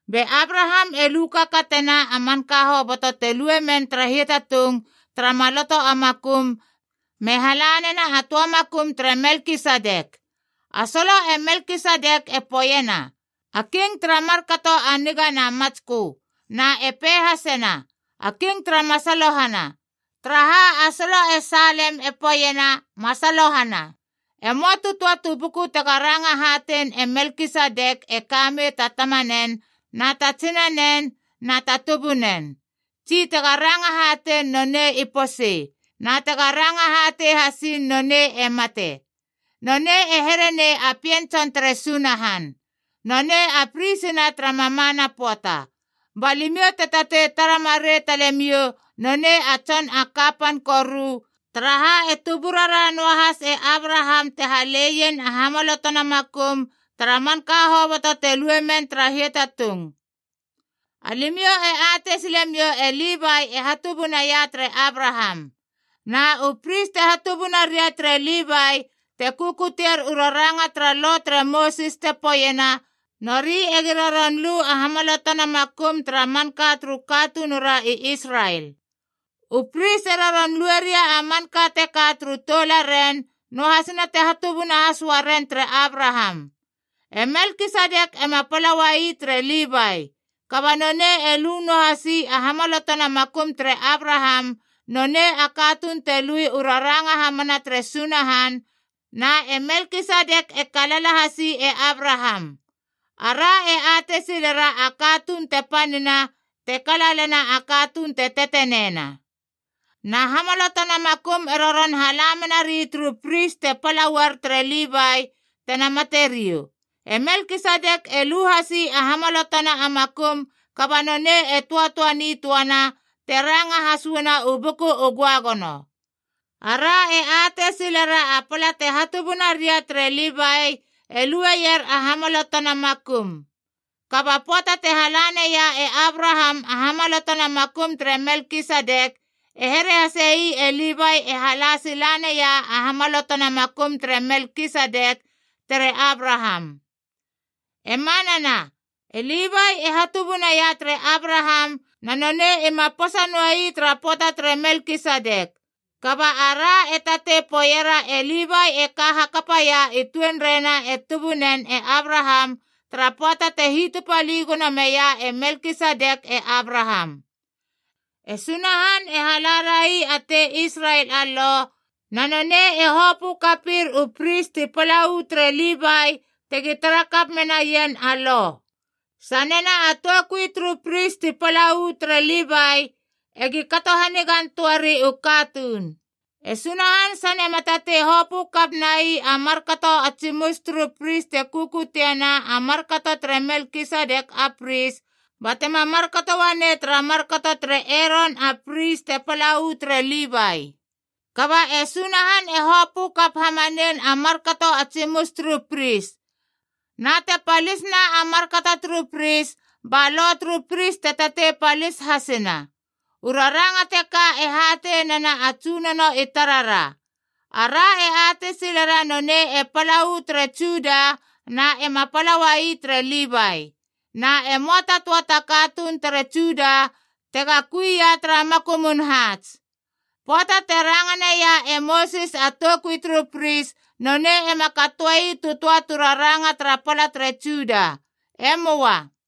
Be Abraham e lu kakatena a manka hoboto te lue men tara hiatatung tara maloto a makum me hala nena a töa makum tere Melkisedek. A solo, e Melkisedek e poeiena, A king tara markato a niga na matskö. Na e pei hasena, A king tara masalohana, taraha a solo e Salem e poeiena, masalohana. E möa tu töa tu buku tega ranga hatein e Melkisedek e ka mei ta tamanen na ta tsinanen na ta tubunen, tsi tega ranga hatein nonei i posei, na tega ranga hatei hasiin nonei e mate. Nonei e here nei a Pien tson tere Sunahan. Nonei a pris na tara mamana pöata. Ba limiou te tatei tara marei talemiou nonei a tson a kapan koru, taraha e tuburara noahas e Abraham te haleien a hamalotona makum tara manka hoboto te lue men tara hiatatung. Alimiou e atei silemiou e Livai e hatubunaia tere Abraham. Na u pris te hatubuna ria tere Livai te kukutier u raranga tara Lo tere Mosis te poeiena nori egi roron lu a hamalotona makum tara manka turu katunura i Israel. U pris e roron lue ria a manka teka turu toularen, noahasina te hatubuna has uaren tere Abraham. E Melkisedek ema pala uai tere Livai. Kaba nonei e lu noa hasi a hamalotona makum tere Abraham, nonei a katuun te lui u raranga hamana tere Sunahan, na e Melkisedek e kalala hasi e Abraham. Ara e atei silera a katuun te panina te kalalena a katuun te teteneina. Na hamalotona makum e roron hala menari turu pris te pala uar tere Livai, tena materiou. E Melkisedek e lu hasi a hamalotona a makum kaba nonei e töatöa nitöana, te ranga has uana u Buku u Göagono. Ara e atei silera a pala te hatubuna ria tere Livai e lueier a hamalotona makum. Kaba pöata te hala naia e Abraham a hamalotona makum tere Melkisedek, e here hasei e Livai e hala sila nai a hamalotona makum tere Melkisedek tere Abraham. E manana, e Livai e hatubunaia tere Abraham, na nonei ima posa noe ii tara pöata tere Melkisedek. Kaba ara e tatei poeiera e Livai e ka hakapaia i tuenreina e tubunen e Abraham tara pöata te hitupali gono meia e Melkisedek e Abraham. E Sunahan e halarai a tei Israel a Lo, na nonei e hopö kapir u pris ti pala uu tere Livai tegi tara kap menaien a Lo. Sanena a toukui turu pris ti pala uu tere Livai egi kato hanigan töari u katuun, e Sunahan sane ma tatei hopö kap nai a markato a tsimus turu pris te kukutiena a markato tere Melkisedek a pris, batema markato uanei tara markato tere Eron a pris te pala u tere Livai. Kaba e Sunahan e hopö kap hamanein a markato a tsimus turu pris. Na te palisna a markato turu pris, ba lo turu pris te tatei palis hasina. U raranga teka e hatei nena a Tsunono i tarara. Ara e atei silera nonei e pala uu tere Juda na ema pala ua ii tere Livai. Na e möa ta töa ta katuun tere Juda tega kui ia tara makumun haats. Pöata te ranga naia e Mosis a toukui turu pris, nonei ema katoe ii tu töa tu raranga tara pala tere Juda. E möa.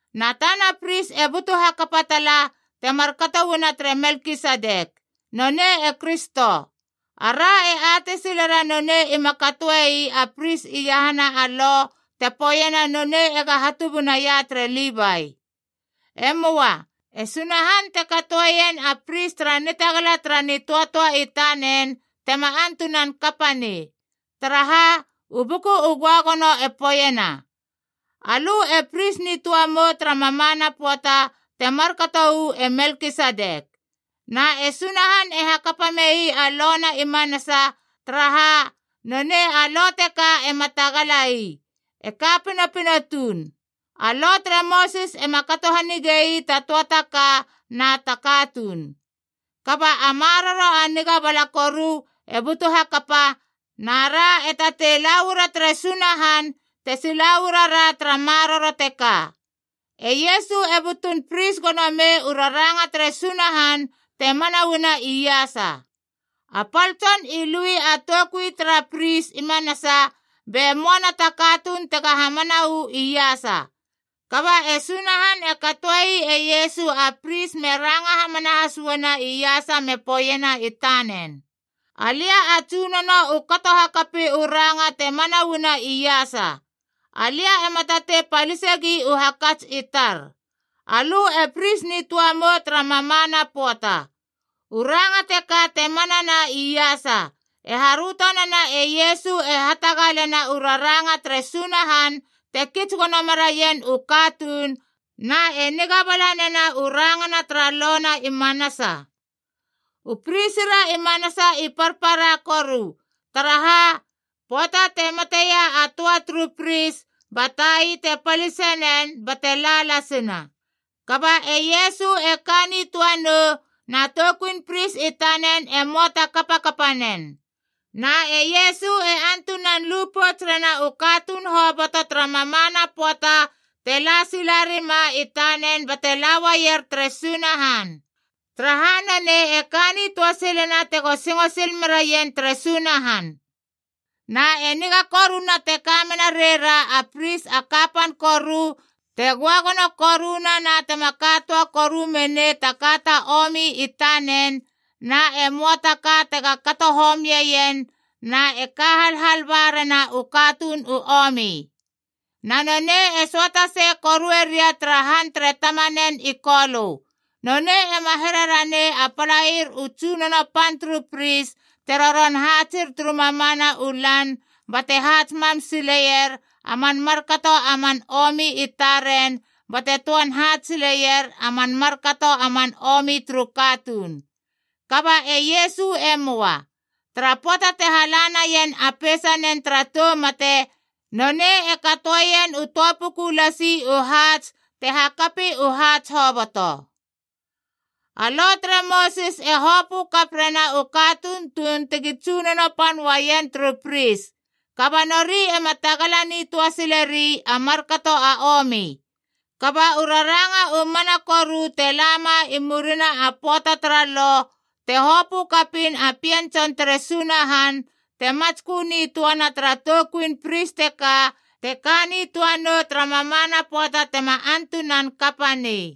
Na tana pris e butu hakapa tala te markato uana tere Melkisedek. Nonei e Kristo. Ara e atei silera nonei ima katoe ii a pris iahana a Lo te poeiena nonei ega hatubunaia tere Livai. E möa. E Sunahan te katoeien a pris tara nitagala tara nitöatöa i tanen tema antunan kapa nei. Taraha, u Buku u Göagono e poeiena: “Alö e pris nitöa mou tara mamana pöata te markato uu e Melkisedek.” Na e Sunahan e hakapa mei a lo na i manasa, taraha nonei a lo teka ema tagala ii, e ka pinopino tuun. A Lo tere Mosis ema kato hanige ii ta töa ta ka na ta katuun. Kaba a maroro a niga bala koru e butu hakapa, na ra e tatei la uara tere Sunahan te sila uara ra tara maroro teka. E Iesu e butun pris gono mei u raranga tere Sunahan te mana uana iasa. A pal tson i lui a toukui tara pris i manasa be möana ta katuun tega hamana uu iasa. Kaba e Sunahan e katoe ii e Iesu a pris me ranga hamana has uana iasa me poeiena i tanen, “Alia a Tsunono u kato hakapi u ranga te mana uana iasa. Alia ema tatei palisegi u hakats i tar. ‘Alö e pris nitöa mou tara mamana pöata.’” U ranga teka te manana iasa, e haröto nena e Iesu e hatagalena u raranga tere Sunahan te kits gono meraien u katuun na e niga bala nena u rangana tara Lo na i manasa. U pris ra i manasa i parpara koru, taraha, pöata te mateia a töa turu pris ba tai te palise nen bate la lasina. Kaba e Iesu e ka nitöa nou, na toukuin pris i tanen e möa ta kapakapa nen. Na e Iesu e antunan lu pouts rena u katuun hoboto tara mamana pöata te la sila rima i tanen bate la uaier tere Sunahan, taraha nonei e ka nitöa silena tego singo sil meraien tere Sunahan. Na e niga koruna te ka menareira a pris a kapan koru te göagono koruna na tema ka töa koru menei ta ka ta omi i tanen na e möa ta ka tega kato homieien na e ka halhal barena u katuun u omi. Na nonei e söata sei korue ria tara han tere tamanen i Kolö. Nonei ema here ranei a palair u tsunono pan turu pris te roron haatsir turu mamana u lan bate haats mam sileier a man markato a man omi i taren bate töan haats sileier a man markato a man omi turu katuun. Kaba e Iesu e möa. Tara pöata te hala naien a peisanen tara tou mate, nonei e katoeien u töa puku lasi u haats te hakapi u haats hoboto. A Lo tere Mosis e hopö kap rena u katuun tuun tegi tsunono pan uaien turu pris, kaba nori ema tagala nitöa sileri a markato a omi. Kaba u raranga u mana koru te lama i murina a pöata tara Lo, te hopö kapiin a Pien tson tere Sunahan te matskö nitöana tara toukuin pris teka te ka nitöa nou tara mamana pöata tema antunan kapa nei.